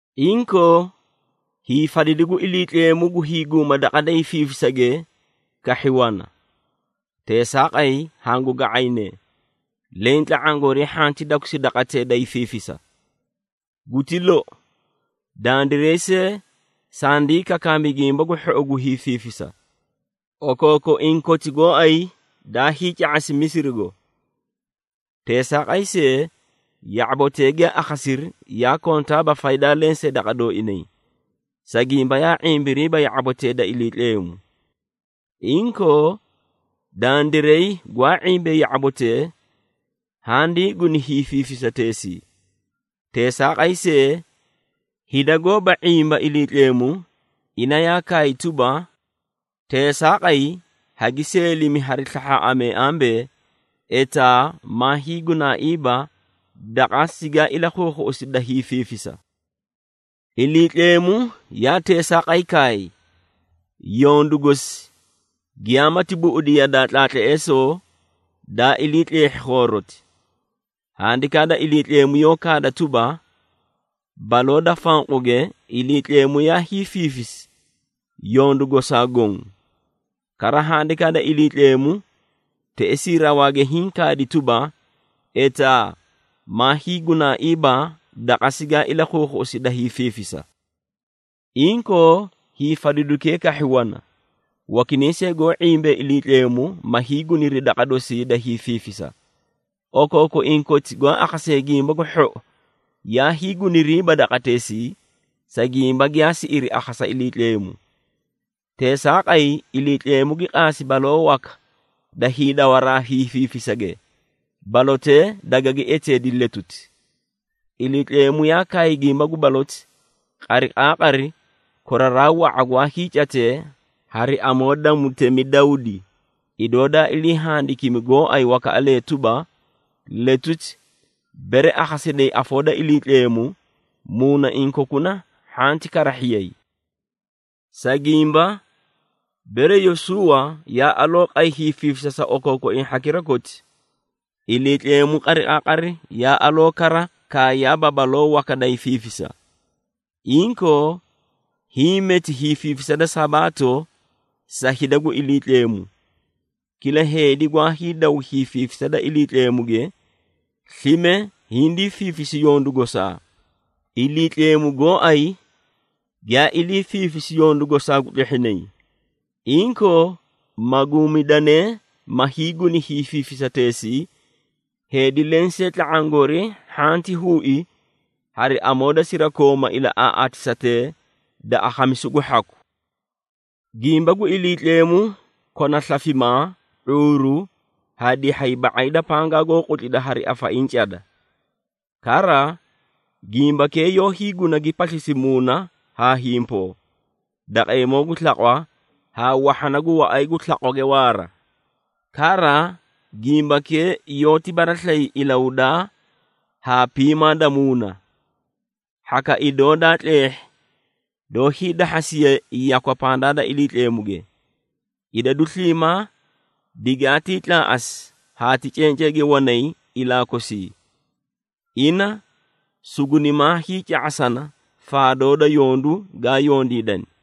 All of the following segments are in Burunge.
Inkoo, hiifadidu gu Iliitleemu gu hiiguma daqa da hiifiifisage kahhi wana. Teesaaqay, hangu ga⁄ayne, leẽ tla⁄aã goorii hhanti dakusi daqatee da hiifiifisa. Guti lou, dandiray see sandii kakaami Gimba gu Hhou gu hiifiifisa, okookoiĩ koti gooay daa hiica⁄asi Misirigo. Teesaaqay see, ya⁄abotee giyaa akhasiri yaa kontaaba faydaa lensee daqa dooinay, sa gimba yaa ⁄imbiriiba ya⁄abotee da Iliitleemu. Inkoo, dandiray gwaa ⁄imbee ya⁄abotee, handii guni hiifiifisateesii. Teesaaqay see, hida gooba ⁄imba Iliitleemu, ina yaa kaay tuba, “Teesaaqay, hagi seelimi hari slahhaaꞌamee ambee, ‘Etaa maa hiigunaaiiba daqa sigaa ilakhuukhuꞌusi da hiifiifisa!’” Iliitleemu yaa teesaaqay kaay, yondu gosi giyamaati buꞌudi yadaa tlaatleesoo daa ilii tleehhi khooroti. Handikaa da Iliitleemu yoó kaada tuba, “Baloo da fanquge Iliitleemu yaa hiifiifisi yondu gosaa goõ.” Kara, Handikaa da Iliitleemu teꞌesii rawaage hiĩ kaadi tuba, “Etaa maa hiigunaaiiba daqa sigaa ilakhuukhuꞌusi da hiifiifisa!” Inkoo, hiifadidukee kahhi wana, wakinay see goó ⁄imbee Iliitleemu, ma hiiguniri daqa dosii da hiifiifisa. Okookoiĩ koti gwaa akhasee Gimba gu Hhou yaa hiiguniriiba daqateesii, sa gimba giyaa siꞌiri akhasa Iliitleemu. Teesaaqay, Iliitleemu gi qaasi baloo waka da hiidawaraa hiifiifisage, balotee dagagi eteedi “Letuti.” Iliitleemu yaa kaay gimba gu baloti, qariqaaqari koraraa wa⁄a gwaa hiicatee hari amoo da mutemi Dawdi, idoo daa ilii handikimi gooay wakaꞌalee tuba, “Letuti, bere akhasidayi afoo da Iliitleemu, muunaiĩ kokuna hhanti karahhiyay.” Sa gimba, bere Yosuuwa yaa aloo qay hiifiifisa sa okookoiĩ hhakira koti, Iliitleemu qariqaaqari yaa aloo kara kaayaaba baloo waka da hiifiifisa. Inkoo, hiĩ meti hiifiifisa da Sabaato sa hida gu Iliitleemu. Kila heedi gwaa hiidaw hiifiifisa da Iliitleemuge, slime hindii fiifisi yondu gosaa, Iliitleemu gooay giyaa iliifiifisi yondu gosaa gu tlehhinay. Inkoo, maguumidanee ma hiiguni hiifiifisateesii, heedi lensee tla⁄aã goori hhanti huui hari amoo da sirakooma ilaꞌaaꞌaatisatee da akhamisu gu hhaku. Gimba gu Iliitleemu kona slafimaa, ⁄uuru haa dihhay ba⁄ay da pangaa goó qutlida hari afaiĩ cada. Kara, gimbakee yoó hiiguna gi paslisi muuna haa himpoo, daqeemoo gu slaqwa haa wahhana gu waꞌay gu slaqwage waara. Kara, gimbakee yoóti baraslayi ilahudaa haa piimaa da muuna. Hhaka idoo daa tleehhi doó hiidahhasiye yakwa pandaa da Iliitleemuge. Idadu sliimaa digaatii tlaaꞌasi haa ti cenceege wanay ilaa kosii. Ina sugunimaa hiica⁄asana faadoo da yondu gaa yondiidani.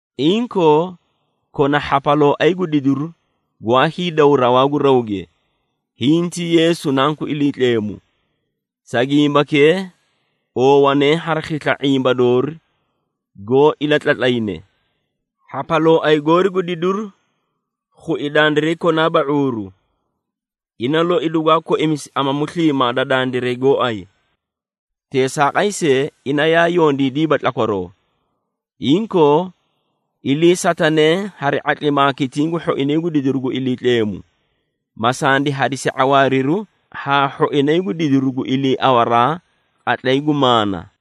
Inkoo, kona hhapalooay gu didiru gwaa hiidaw rawaa gu rawge. Hiĩ ti Yeesu Nanku Iliitleemu. Sa gimbakee, oowanee hari khisla ⁄imba doori goó ilatlatlayne. Hhapalooay goori gu didiru khui dandiray konaaba ⁄uuru. Ina loi dugwaa koimisi amamu sliimaa da dandiray gooay. Teesaaqay see, ina yaa yondiidiiba tlakwaroo. Inkoo, iliisatanee hari ⁄atlimaa kitiĩ gu hhoinay gu didiru gu Iliitleemu, ma sandi hadisi ⁄awaariru haa hhoinay gu didiru gu iliiawaraa qatlay gu maana.